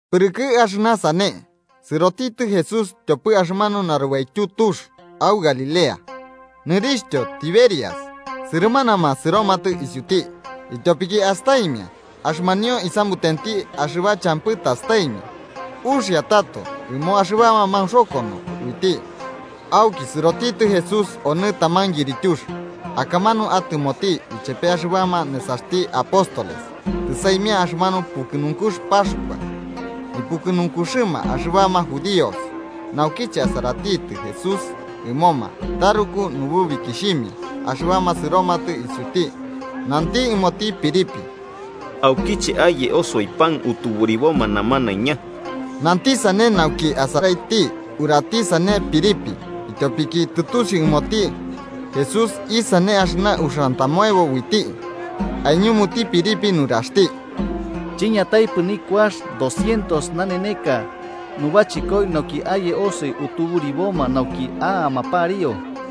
Pɨrɨkɨ axɨna sane, sɨrotitɨ Jesús tyopɨ axɨmanu narubaityu tux au Galilea, nɨrixhtyo Tiberias. Sɨrɨmanama sɨromatɨ isiuti, ityopiki astaimia axɨmanio isamutenti axɨba champɨ tastaimia uxia tato ɨmo axɨbama maunxokono uiti. Auki sɨrotitɨ Jesús onɨ taman yirityux, akamanu atɨmoti ichepe axɨbama nesaxti apóstoles. Tɨsaimia axɨmanu pukɨnunkux Paxkua, nipukɨnunkuxɨma axɨbama judíos. Naukiche asaratitɨ Jesús ɨmoma taruku nububikixhimia axɨbama sɨromatɨ isiuti, nanti ɨmoti Felipe: –¿Aukiche aye osoi pan utuburiboma namanaiña? Nanti sane nauki asaraiti urati sane Felipe, ityopiki tɨtusiu ɨmoti Jesús isane axɨna uxiantamoebo uiti. Aiñumuti Felipe nuraxti: –Chiñataipɨ nikuax doscientos naneneka nubachɨkoi nauki aye osoi utuburiboma nauki a'ama pariu.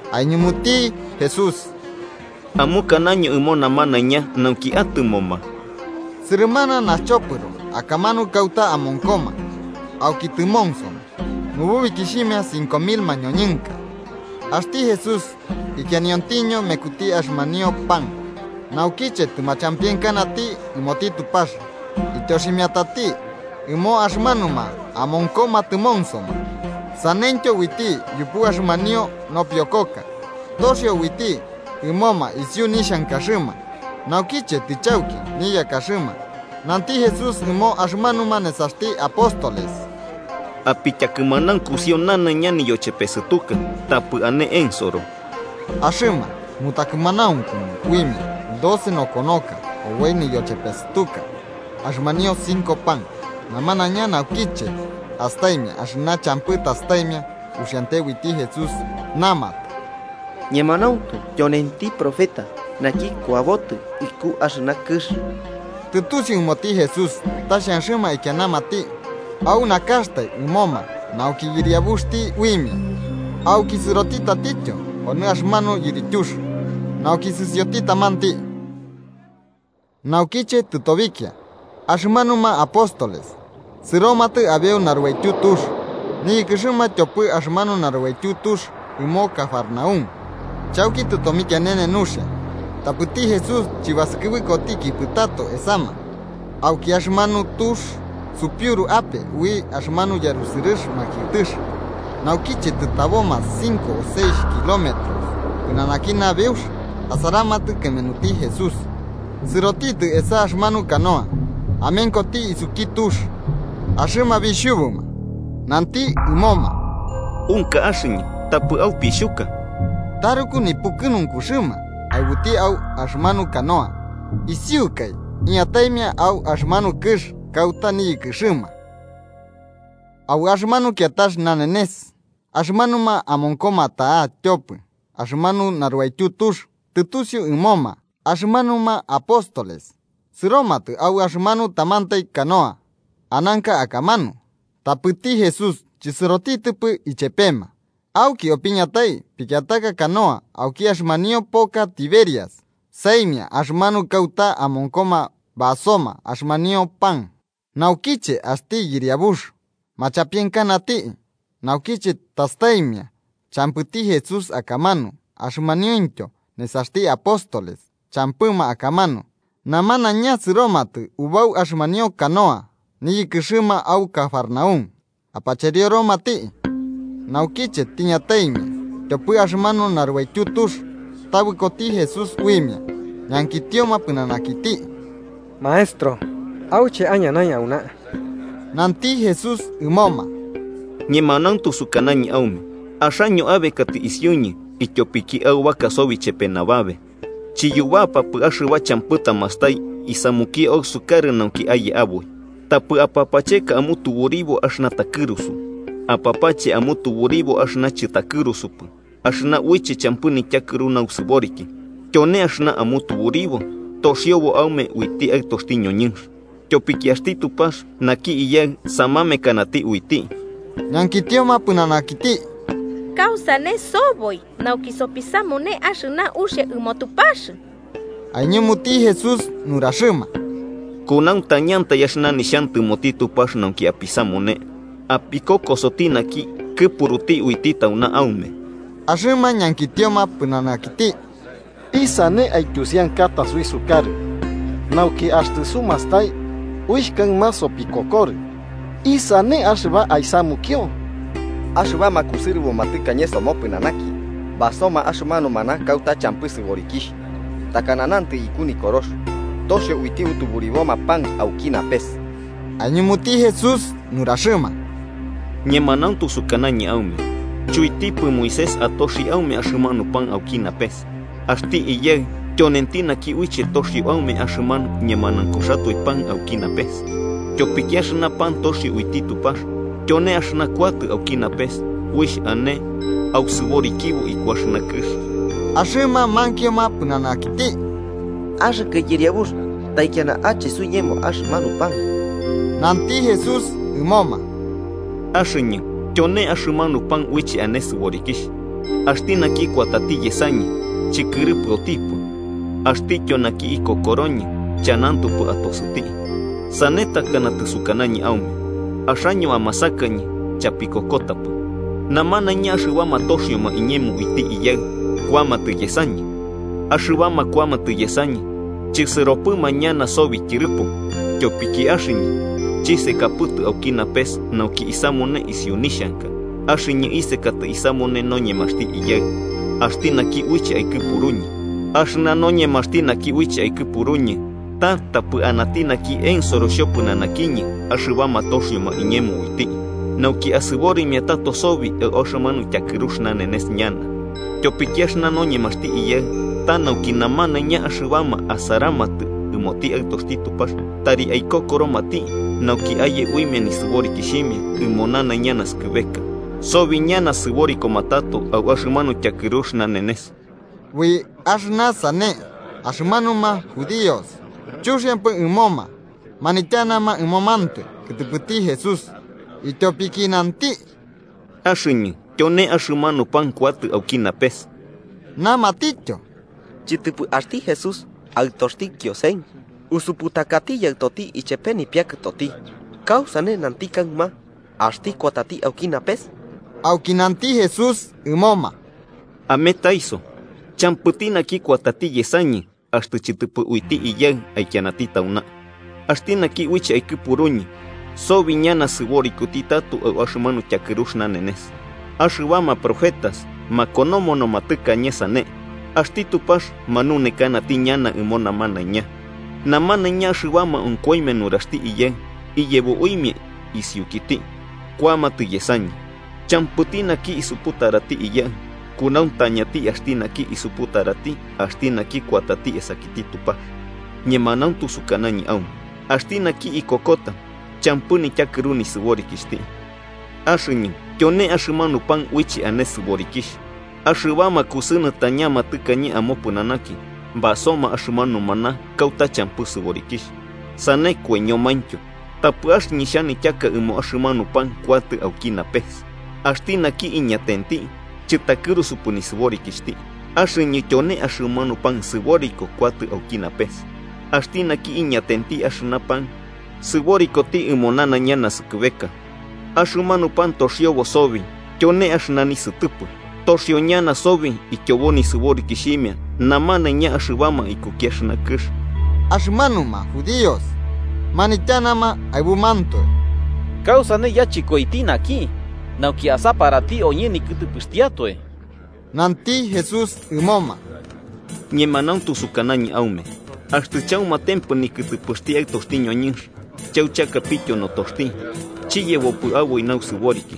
Aiñumuti Jesús: –Amukanaño ɨmo namanaiña nauki atɨmoma. Sɨrɨmana naxchopɨro akamanu kauta amonkoma, auki tɨmonsoma. Nububikixhima cinco mil mañoñɨnka. Axti Jesús ikianiontiño mekuti axɨmanio pan, naukiche tɨmachampienkanati ɨmoti Tupax, ityoximiatati ɨmo axɨmanuma amonkoma tɨmonsoma. Saneityo uiti yupu axɨmanio nopiokoka, toxio uiti ɨmoma isiu nixhankaxɨma. Naukiche tɨchauki niyakaxɨma, nanti Jesús ɨmo axɨmanuma nesaxti apóstoles: –Apityakɨmanaunkusio nanaiña niyochepesɨtuka, tapɨ ane ensoro. Axɨma mutakɨmanaunkunu uimia, doce nokonoka oboi niyochepesɨtuka axɨmanio cinco pan. Namanaiña, naukiche astaimia axɨna champɨ tastaimia uxiante uiti Jesús, namatɨ: –Ñemanauntu tyonenti profeta naki kuabotɨ iku axɨna kɨx. Tɨtusiu ɨmoti Jesús ta xhanxɨma aikianamati au nakaxtai ɨmoma nauki yɨriabuxti uimia, auki sɨrotitɨ tatityo onɨ axɨmanu yirityux, nauki sɨsioti tamanti. Naukiche tɨtobikia, axɨmanuma apóstoles sɨromatɨ abeu narubaityu tux, niyɨkɨxɨma tyopɨ axɨmanu narubaityu tux ɨmo Cafarnaúm. Chauki tɨtomikianene nuxia, tapɨti Jesús chɨbasɨkɨbɨkotikipɨ tato esama. Auki, axɨmanu tux supiuru ape ui axɨmanu yarusɨrɨx makiɨtɨx. Naukiche tɨtaboma cinco o seixh kilómetros pɨnanaki nabeux, asaramatɨ kɨmenuti Jesús, sɨrotitɨ esa axɨmanu canoa amenkoti isuki tux, axɨma bixhubuma. Nanti ɨmoma: –¡Unka axɨñɨ, tapɨ aupixhuka! Taruku nipukɨnunkuxɨma aɨbuti au axɨmanu canoa, isiukai iñataimia au axɨmanu kɨx kauta niyɨkɨxɨma. Au axɨmanu kiatax nanenes axɨmanuma amonkoma ta'a tyopɨ axɨmanu narubaityu tux tɨtusiu ɨmoma axɨmanuma apóstoles sɨromatɨ au axɨmanu tamantai canoa ananka akamanu, tapɨti Jesús chɨsɨrotitɨpɨ ichepema. Auki opiñatai pikiataka canoa auki axɨmanio poka Tiberias saimia axɨmanu kauta amonkoma basoma axɨmanio pan naukiche axti Yɨriabux machampienkanati. Naukiche tastaimia champɨtiki Jesús akamanu axɨmanumaintyo nesaxti apóstoles champɨma akamanu, namanaiña sɨromatɨ ubau axɨmanio canoa niyɨkɨxɨma au Cafarnaúm, apacherioromati. Naukiche tiñataimia tyopɨ axɨmanu narubaityu tux, tabɨkoti Jesús uimia ñankitioma pɨnanakiti: –Maestro, ¿auche aiñanai auna? Nanti Jesús ɨmoma: –Ñemanauntu sukanañɨ aume axaño abekatɨ isiuñɨ ityopiki aubaka sobi chepe nababe, chiyubapapɨ axɨba champɨ tamastai isamukio ausukarɨ nauki aye aboi. Tapɨ apapacheka amutuburibo axɨna takɨrusu, apapache amutuburibo axɨna chɨtakɨrusupɨ axɨna uiche champɨ nityakɨru nausɨboriki. Tyone axɨna amutuburibo toxiobo aume uiti Aɨtoxti ñoñɨnx, tyopiki axti Tupax, naki Iyaɨ samamekanati uiti. Ñankitioma pɨnanakiti: –¿Kausane soboi nauki sopisamune axɨna uxia ɨmoti Tupax? Aiñumuti Jesús nuraxɨma: –Kunauntañantai axɨna nixhantɨmoti Tupax nauki apisamune apikokosoti naki kɨpuruti uiti tauna aume. Axɨma ñankitioma pɨnanakiti: –¿Isane aityusiankata suisukarɨ, nauki axtɨ sumastai uixh kaɨma sopikokorɨ? ¿Isane axɨba aisamukio? Axɨbama kusɨrɨboma tɨkañe somopɨnanaki basoma axɨmanu maná kauta champɨ sɨborikixh, takana nantɨ iku Nikorox: ‘Toxio uiti utuburiboma pan auki napes.’ Aiñumuti Jesús nuraxɨma: –Ñemanauntu sukanañɨ aume chuitipɨ Moisés atoxi aume axɨmanu pan auki napes, axti Iyaɨ tyonenti naki uiche toxio aume axɨmanu ñemanaunkuxatoe pan auki napes. Tyopiki axɨna pan toxio uiti Tupax, tyone axɨna kuatɨ auki napes uixh ane ausɨborikibo iku axɨna kɨx. Axɨma mankioma pɨnanakiti: –Axɨkɨ Yɨriabux, taikiana ache suiñemo axɨmanu pan. Nanti Jesús ɨmoma: –Axɨñɨ tyone axɨmanu pan uiche ane sɨborikixh. Axti naki kuatati yesañɨ, chɨkɨrɨpɨotipɨ. Axtityo naki ikokoroñɨ, chanantopɨ atosɨti. Sane takana tɨsukanañɨ aume, axaño amasakañɨ chapikokotapɨ. Namanaiña axɨbama toxioma iñemo uiti Iyaɨ, kuamatɨ yesañɨ. Axɨbama kuamatɨ yesañɨ, chɨsɨropɨma ñana sobi tyɨrɨpo. Tyopiki axɨñɨ chisekapɨtɨ auki napes nauki isamune isiu nixhanka, axɨñɨ isekatɨ isamune noñemaxti Iyaɨ, axti naki uiche aikɨpuruñɨ. Axɨna noñemaxti naki uiche aikɨpuruñɨ, ta tapɨ anati naki ensoro xhopɨnanakiñɨ axɨbama toxioma iñemo uiti, nauki asɨborimia tato sobi au axɨmanu tyakɨrux nanenes ñana. Tyopiki axɨna noñemaxti Iyaɨ ta nauki namanaiña axɨbama asaramatɨ ɨmoti Aɨtoxti Tupax tari aikokoromati, nauki aye uimia nisɨborikixhimia ɨmo nanaiña naskɨbeka: Sobi ñana sɨborikoma tato au axɨmanu tyakɨrux nanenes. Ui axɨna sane axɨmanuma judíos chuxiampɨ ɨmoma manityanama ɨmomantoe kɨtɨpɨti Jesús, ityopiki nanti: “Axɨñɨ tyone axɨmanu pan kuatɨ auki napes”. Namatityo: –¿Chɨtɨpɨ axti Jesús, aɨtoxti Kiosen? Usuputakati yaɨtoti ichepe nipiakɨtoti. ¿Kausane nanti kaɨma axti kuatati auki napes? Auki nanti Jesús ɨmoma: –Ametaiso. Champɨti naki kuatati yesañɨ, axtɨ chɨtɨpɨ uiti Iyaɨ aikianati tauna, axti naki uiche aikɨpuruñɨ. Sobi ñana sɨborikoti tato au axɨmanu tyakɨrux nanenes. Axɨbama profetas makonomonoma tɨkañe sane: ‘Axti Tupax manunekanati ñana ɨmo namanaiña.’ Namanaiña axɨbama onkoimia nuraxti Iyaɨ iyebo uimia isiukiti, kuamatɨ yesañɨ. “Champɨti naki isuputarati Iyaɨ. Kunauntañati axti naki isuputarati axti naki kuatati esakiti Tupax. Ñemanauntu sukanañɨ aume axti naki ikokota, champɨ nityakɨru nisɨborikixhti. Axɨñɨ tyone axɨmanu pan uiche ane sɨborikixh. Axɨbama kusɨnɨtañama tɨkañe amopɨnanaki basoma axɨmanu maná kauta champɨ sɨborikixh, sane koiñomaintyo. Tapɨ axɨñɨ xhanityaka ɨmo axɨmanu pan kuatɨ auki napes. Axti naki iñatenti, chɨtakɨrusupɨ nisɨborikixhti. Axɨñɨ tyone axɨmanu pan sɨboriko kuatɨ auki napes. Axti naki iñatenti axɨna pan, sɨborikoti ɨmo nanaiña naskɨbeka. Axɨmanu pan toxiobo sobi tyone axɨna nisɨtɨpɨ. Toxio ñana sobi ityobo nisɨborikixhimia namanaiña axɨbama ikuki axɨna kɨx.” Axɨmanuma judíos manityanama aɨbumantoe: –¿Kausane yachɨkoiti naki nauki asaparati oñɨ nikɨtɨpɨxtiatoe? Nanti Jesús ɨmoma: –Ñemanauntu sukanañɨ aume axtɨ chaumatempɨ nikɨtɨpɨxti Aɨtoxti ñoñɨnx chauchakapityo notoxti, chiyebopɨ aboi nausɨboriki.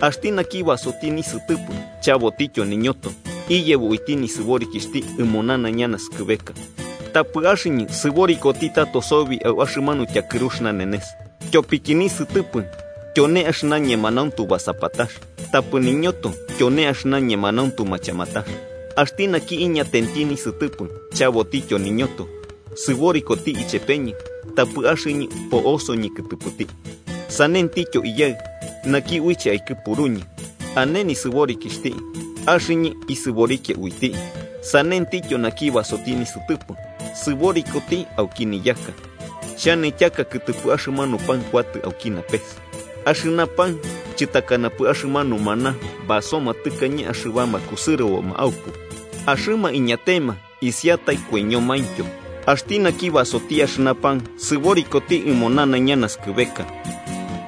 Axti naki basoti nisɨtɨpɨ chabotityo niñoto, iyebo uiti nisɨborikixhti ɨmo nanaiña naskɨbeka. Tapɨ axɨñɨ sɨborikoti tato sobi au axɨmanu tyakɨrux nanenes. Tyopiki nisɨtɨpɨ tyone axɨna ñemanauntu basapatax, tapɨ niñoto tyone axɨna ñemanauntu machamatax. Axti naki iñatenti nisɨtɨpɨ chabotityo niñoto, sɨborikoti ichepeñɨ, tapɨ axɨñɨ po'osoñɨ kɨtɨpɨti. Sanentityo Iyaɨ, naki uiche aikɨpuruñɨ, ane nisɨborikixhti, axɨñɨ isɨborikia uiti. Sanentityo naki basoti nisɨtɨpɨ, sɨborikoti auki niyaka. Xhanityaka kɨtɨpɨ axɨmanu pan kuatɨ auki napes. Axɨna pan chɨtakanapɨ axɨmanu maná basoma tɨkañe axɨbama kusɨrɨboma aupu, axɨma iñatema isiatai koiñomaintyo. Axti naki basoti axɨna pan, sɨborikoti ɨmo nanaiña naskɨbeka.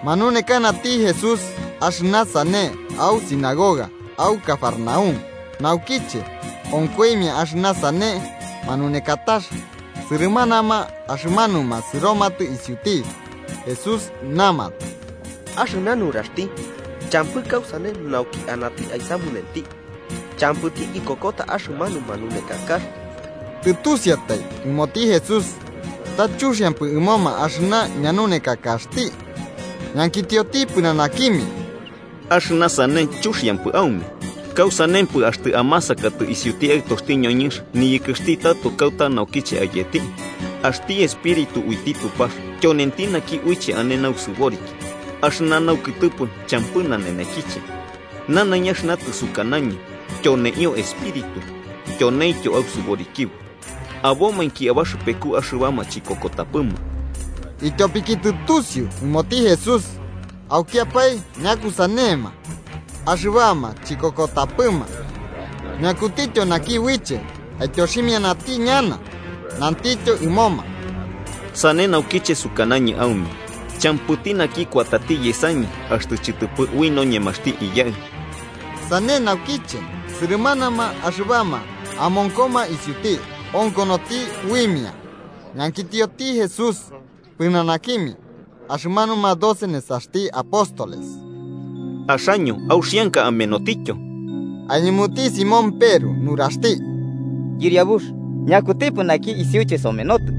Manunekanati Jesús axɨna sane au sinagoga au Cafarnaúm. Naukiche onkoimia axɨna sane manunekatax, sɨrɨmanama axɨmanuma sɨromatɨ isiuti Jesús namatɨ: –Axɨna nuraxti champɨ kausane nauki anati aisamunenti. Champɨti ikokota axɨmanu manunekakax. Tɨtusiatai ɨmoti Jesús ta chuxiampɨ ɨmoma axɨna ñanunekakaxti, ñankitioti pɨnanakimia: –¿Axɨna sane chuxiampɨ aume? ¿Kausanempɨ axtɨ amasakatɨ isiuti Aɨtoxti ñoñɨnx niyɨkɨxti tato kauta naukiche isetɨ? Axti espíritu uiti Tupax tyonenti naki uiche ane nausɨboriki. Axɨna naukɨtɨpɨ champɨ nanenekiche. Nanaiña axɨna tɨsukanañɨ, tyoneio espíritu tyoneintyo ausɨborikibo. Abomainki abaxɨpeku axɨbama chikokotapɨma. Ityopiki tɨtusiu ɨmoti Jesús aukiapae ñakusanema axɨbama chikokotapɨma, ñakutityo naki uiche aityoximianati ñana. Nantityo ɨmoma: –Sane naukiche sukanañɨ aume champɨti naki kuatati yesañɨ axtɨ chɨtɨpɨ ui noñemaxti Iyaɨ. Sane naukiche sɨrɨmanama axɨbama amonkoma isiuti onkonoti uimia, ñankitioti Jesús pɨnanakimia axɨmanuma doce nesaxti apóstoles: –¿Axaño auxianka amenotityo? Aiñumuti Simón Peru nuraxti: –Yɨriabux, ¿ñakutipɨ naki isiuche somenotɨ?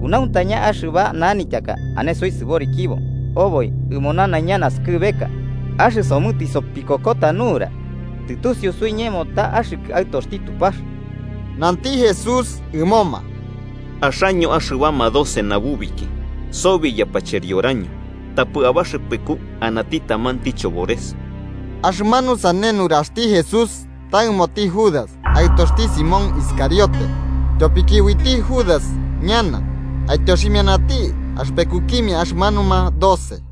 Kunauntaña axɨba nanityaka ane suisɨborikibo oboi ɨmo nanaiña naskɨbeka. Axɨsomɨ tɨsopikokota nura, tɨtusiu suiñemo ta axɨkɨ Aɨtoxti Tupax. Nanti Jesús ɨmoma: –Axaño axɨbama doce nabubiki, sobi yapacherioraño. Tapɨ abaxɨpeku anati tamanti chobores. Axɨmanu sane nuraxti Jesús ta ɨmoti Judas, aɨtoxti Simón Iscariote. Tyopiki uiti Judas ñana, aityoximianati axɨpekukimia axɨmanuma doce.